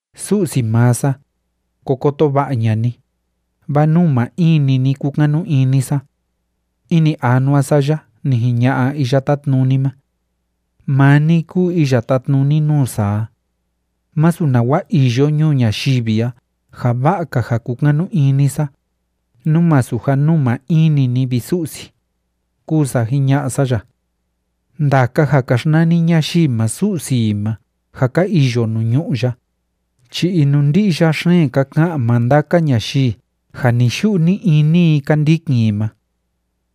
Su'si maa sa, ko koto va'a ña'a ni, vaa nuu maa in‑ni ni kúkanu ini sa. Ini anua sa ya ni jiña'a Iya Tátnuni ma: “Maa ni kúu iya tátnuni nuu sa a. Masu nawa iyo ñuu ñayivi a ja va'a‑ka ja kukanu ini sa, nú masu ja nuu maa in‑ni ni, vi Su'si”, kúu sa jiña'a sa ya. Ndaka ja ka xnani ñayii ma su'si i ma ja ka iyo nuu ñu'ú ya, chi inundi'ya xeen ka ka'an maa ndaka ñayii ja ni‑yu'u ni‑ini i ka ndikin i ma.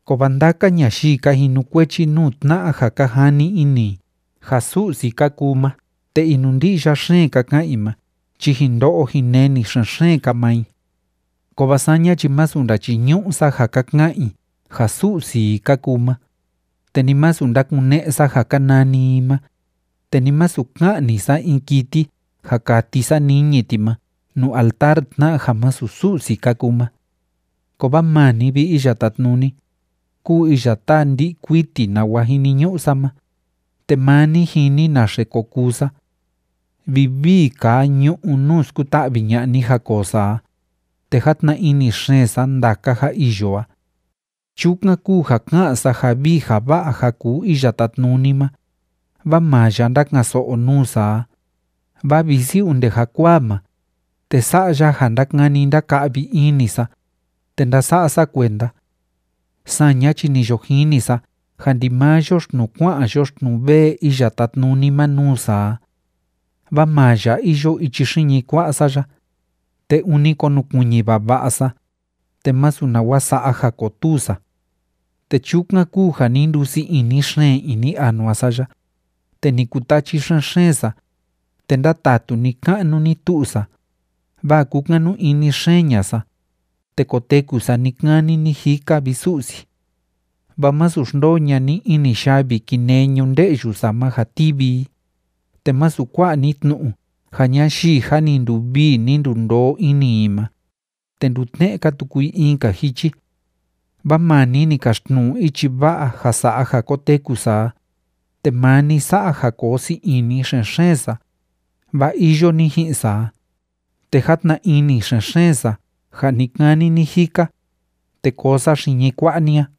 Kovaa ndaka ñayii ka jinukuechi nuu tna'a ja ka jani ini i ja su'si ka kuu ma te inundi'ya xeen ka ka'an i ma chi jin ndo'o jin neni xen‑xeen‑ka maa i. Kovaa saña chi masu ndachiñu'u sa ja ka ka'an i ja su'si i ka kuu ma, te ni masu ndakune'e sa ja ka nani i ma, te ni masu ka'ni sa in kiti ja kati sa niñi ti ma nuu altar tna'a ja másu Su'si ka kuu ma. Kovaa maa ni, vi Iya Tátnuni, kúu iya táa ndi'i kuiti nawa jiniñu'u sa ma, te maa ni jini naxe ko kuu sa. Vivii kaa ñu'ú nuu skuta'vi ña'a ni ja koo sa a, te játna ini xeen sa ndaka ja iyo a. Chukan kúu ja ká'an sa ja vii ja va'a ja kuu Iya Tátnuni ma, vaa maa ya ndákan‑so'o nuu sa a, vaa visi onde jakuaa ma, te sa'a ya ja ndákani ndáka'vi ini sa, te ndása'a sa kuenda. Saña chi ni yo jini sa ja ndimaa yoxtnuu kua'an yoxtnuu vee Iya Tátnuni ma nuu sa a. Vaa maa ya iyo ichi xiñi kua'a sa ya, te ûni konukuiñi vava'a sa, te másu nawa sa'a ja kotuu sa. Te chukan kúu ja ni ndusii ini xeen ini anua sa ya, te ni kutachi xen‑xeen sa, te ndátatu ni‑ka'nu ni‑tu'u sa, vaa kúkanu ini xeen ña'a sa, te koteku sa ni‑kani ni‑jika, vi Su'si. Vaa másu xndoo ña'a ni ini yavi kinee ñu'ú‑nde'yu sa ma ja tivi i, te másu kua'a ni tnu'u ja ñayii jâ ni nduvii ni ndundoo ini i ma, te ndutne'e‑ka tuku i in‑ka jichi. Vaa maa ni ni kaxtnu'u ichi va'a ja sa'a ja koteku sa a, te maa ni sa'a ja koo sii ini xen‑xeen sa, vaa iyo ni ji'in sa a, te játna ini xen‑xeen sa ja ni‑kani ni‑jika, te koo sa xiñi kua'a ni a.